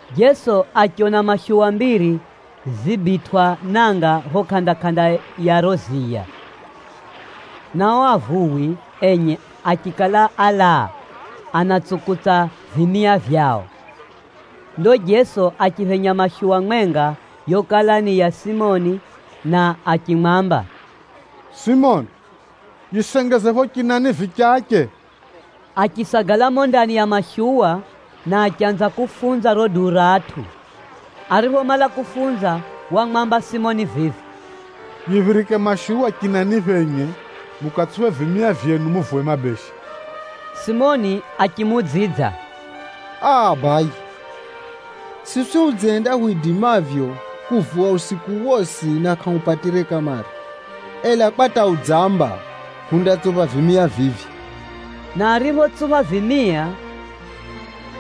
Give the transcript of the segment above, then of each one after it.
Jeso achiona mashuwa mbiri zibitwʼa nanga phapho kʼanda-kʼanda ya riro ziya, na ao avuwi enye achikala álaa anatsukutsa vimia vyao. Ndo Jeso achiphenya mashuwa mwenga yokala ni ya Simoni na achimwamba, “Simoni, Simoni ni dzina rinjine ra Pʼetero. yisengeze phapho chinani vichache.” Achisagala mumo ndani ya mashuwa, na achanza kufunza riro duu ra atʼu. Ariphomala kufunza wamwamba Simoni vivi, “Yiphirike mashuwa chinani phenye mukatsuphe vimia vyenu muvuwe mabeshe.” Simoni achimuudzidza, “Aa! Baye, siswi hudzihenda hwidimavyo kuvuwa usiku wosi na kʼahupatire kamare, ela kwa hata udzamba, hundatsupha vimia vivyo.” Na ariphotsupha vimia,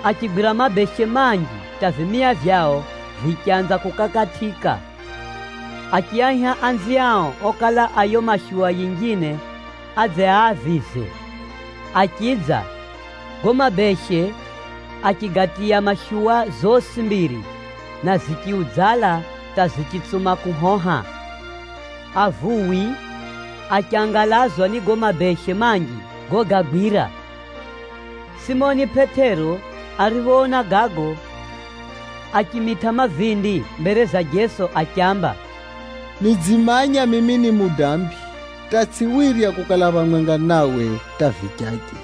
achigwira mabeshe manji hata vimia vyao vichanza kukakatʼika. Achiaiha anziao okala a yiyo mashuwa yinjine adze aavize. Achidza, gago mabeshe achigatiya mashuwa zosi mbiri na zichiudzala hata zichitsuma kuhoha. Avuwi achangalazwa ni gago mabeshe manji gogagwira. Simoni Pʼetero ariphoona gago, achimitʼa mavindi mbere za Jeso achiamba, “Nidzimanya mimi ni mudambi hata tsʼiwirya kukala phamwenga nawe hata vichache!”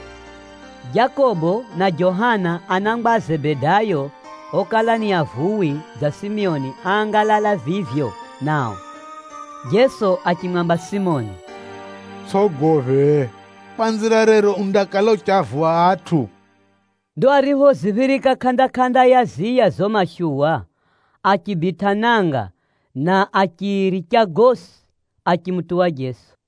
Jakobo na Johana anangwa a Zebedayo okala ni avuwi dza Simoni áangalala vivyo nao. Jeso achimwamba Simoni, “Utsʼogophe, kwanzira rero undakala uchiavuwa atʼu.” Ndo ariphoziphirika kʼanda-kʼanda ya ziya zizo mashuwa, achibitʼa nanga na achiricha gosi achimutuwa Jeso.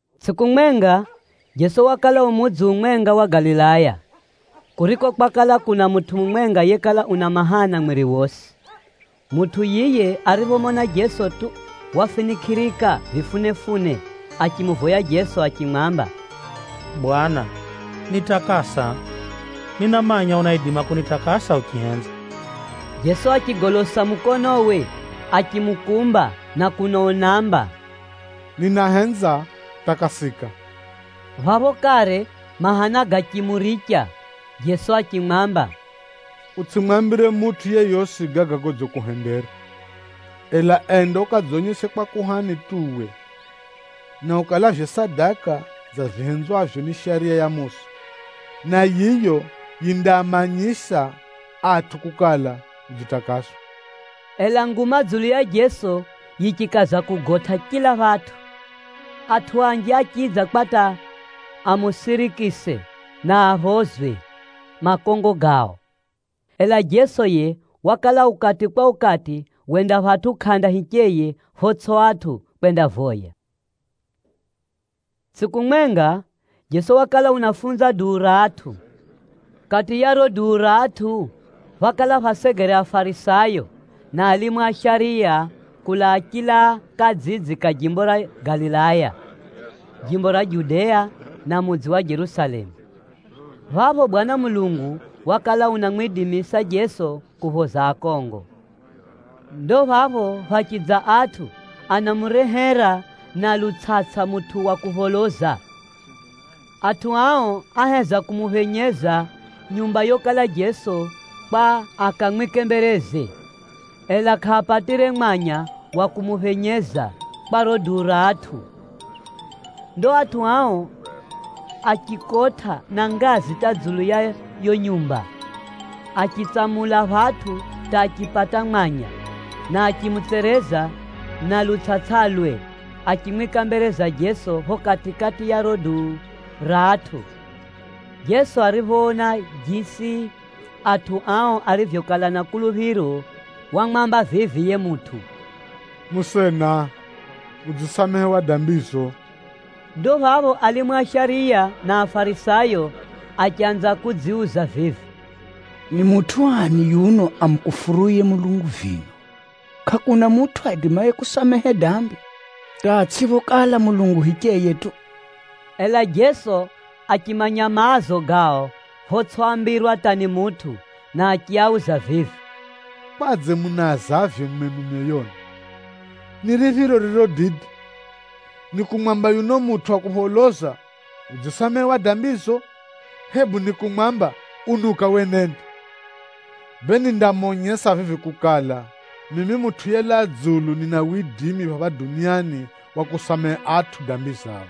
Tsʼiku mwenga, Jeso wakala u mudzi umwenga wa Galilaya, kuriko kwakala kuna mutʼu mumwenga yekala una mahana mwiri wosi. Mutʼu yiye ariphomona Jeso tu, wafinikʼirika vifunefune achimuvoya Jeso achimwamba, “Bwana, nitakasa. Ninamanya unaidima kunitakasa uchihenza.” Jeso achigolosa mukonowe achimukumba na kuno unaamba, “Ninahenza, takasika!” Phapho kare mahana gachimuricha. Jeso achimwamba, “Utsʼimwambire mutʼu yeyosi gaga godzikuhendera. Ela enda ukadzonyese kwa kuhani tu uwe, na ukalavye sadaka dza vihenzwavyo ni Shariya ya Musa, na yiyo yindaamanyisa atʼu kukala udzitakaswa.” Ela nguma dzulu ya Jeso yichikaza kugotʼa chila phatʼu. Atʼu anji achidza kwa hata amusirikise na aphozwe makongo gao. Ela Jeso yiye wakala ukati kwa ukati wenda phatʼu kʼanda hicheye photsʼi atʼu kwendavoya. Tsʼiku mwenga, Jeso wakala unafunza duu ra atʼu. Kati ya riro duu ra atʼu, phákala phasegere Afarisayo, na alimu a shariya kulaa chila kadzidzi kariko jimbo ra Galilaya, jimbo ra Judea na mudzi wa Jerusalemu. Phapho Bwana Mulungu wakala unamwidimisa Jeso kuphoza akongo. Ndo phapho phachidza atʼu okala atsukula mutʼu wa kupholoza na lutsʼatsʼa. Atʼu ao áheza kumuphenyeza nyumba yokala Jeso kwa akamwike mbereze, ela kʼaapatire mwanya wa kumuphenyeza kwa riro duu ra atʼu. Ndo atʼu ao achikotʼa na ngazi hata dzulu ya yiyo nyumba, achitsamula phatʼu hata achipata mwanya, na achimutsereza na lutsʼatsʼalwe, achimwika mbere za Jeso phapho kati-kati ya riro duu ra atʼu. Jeso ariphoona jisi atʼu ao arivyokala na kuluphiro, wamwamba vivi yiye mutʼu, “Musena, udzisamehewa dambizo.” Ndo phapho alimu a shariya na Afarisayo achanza kudziuza vivi, “Ni mutʼu ani yuno amukufuruye Mulungu vino? Kʼakuna mutʼu aidimaye kusamehe dambi, hata atsʼiphokala Mulungu hicheye tu!” Ela Jeso achimanya maazo gao photsʼiambirwa hata ni mutʼu, na achiauza vivi, “Kwadze munaazavyo mwenu myoyoni? Ni riphiro ririro dide, ni kumwamba yuno mutʼu wa kupholoza, ‘Udzisamehewa dambizo,’ hebu ni kumwamba, ‘Unuka wenende’? Bee, vivi nindamonyesa kukala, mimi Mutʼu yelaa dzulu nina widimi phapha duniani wa kusamehe atʼu dambi zao.”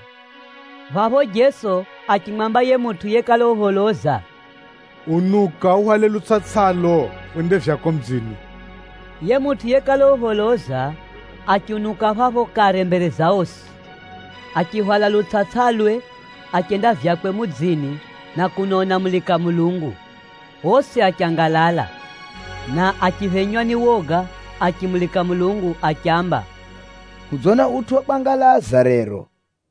Phapho Jeso achimwamba yiye mutʼu yekala upholoza vivi, “Unuka uhwale lutsʼatsʼalo, wende vyako mudzini.” Yiye mutʼu yekala upholoza achiunuka phapho kare mbere za osi, achihwala lutsʼatsʼalwe achenda vyakwe mudzini na kuno unamulika Mulungu. Osi achangalala, na achiphenywa ni woga achimulika Mulungu achiamba, “Hudzona utʼu wa kwangalaza rero.”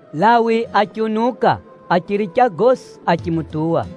Lawi achiunuka achiricha gosi achimutuwa.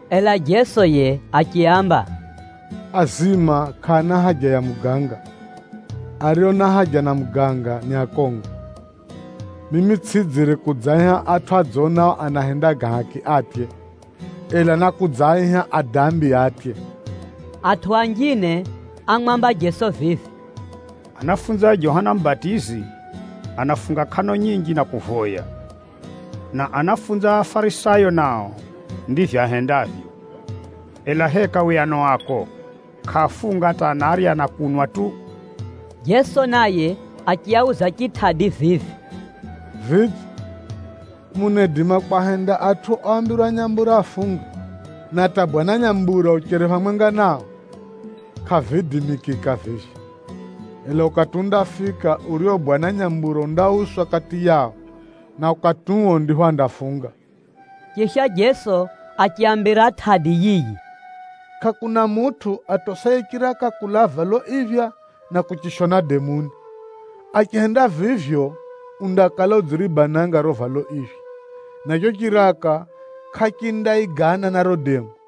Ela Jeso yiye achiaamba, “Azima kʼaana haja na muganga, ario na haja na muganga ni akongo. Mimi tsʼidzire kudzaaiha atʼu adzonao anahenda ga haki atye, ela nákudzaaiha adambi atye.” Atʼu anjine ámwamba Jeso vivi, “Anafunzi a Johana Mubatizi anafunga kʼano nyinji na kuvoya, na anafunzi a Afarisayo nao ndivyo ahendavyo. Ela heka uwe ano ako kʼaafunga hata kazi yao ni kurya na kunwa tu?” Jeso naye achiauza chitʼadi vivi, “Vidze, munaidima kwahenda atʼu oambirwa nyambura afunge, na hata bwana nyambura ucheri phamwenga nao? Kʼaviidimikika vivyo. Ela ukati undafika urio bwana nyambura undauswa kati yao, na ukati uo ndipho andafunga.” Chisha Jeso achiaambira tʼadi yiyi, “Kʼakuna mutʼu atosaye chiraka kulaa valo iphya na kuchishona demuni. Achihenda vivyo, undakala udziribananga riro valo iphya, na chicho chiraka kʼachindaigana na riro demu.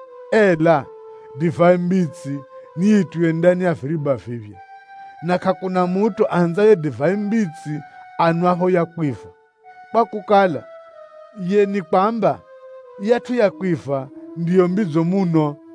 Ela divai mbitsi niyitiywe ndani ya viriba viphya. Na kʼakuna mutʼu ahenzaye divai mbitsi anwapho ya kwiva, kwakukala, yiye nikwamba, yiyatʼu ya kwiva ndiyo mbidzo muno.”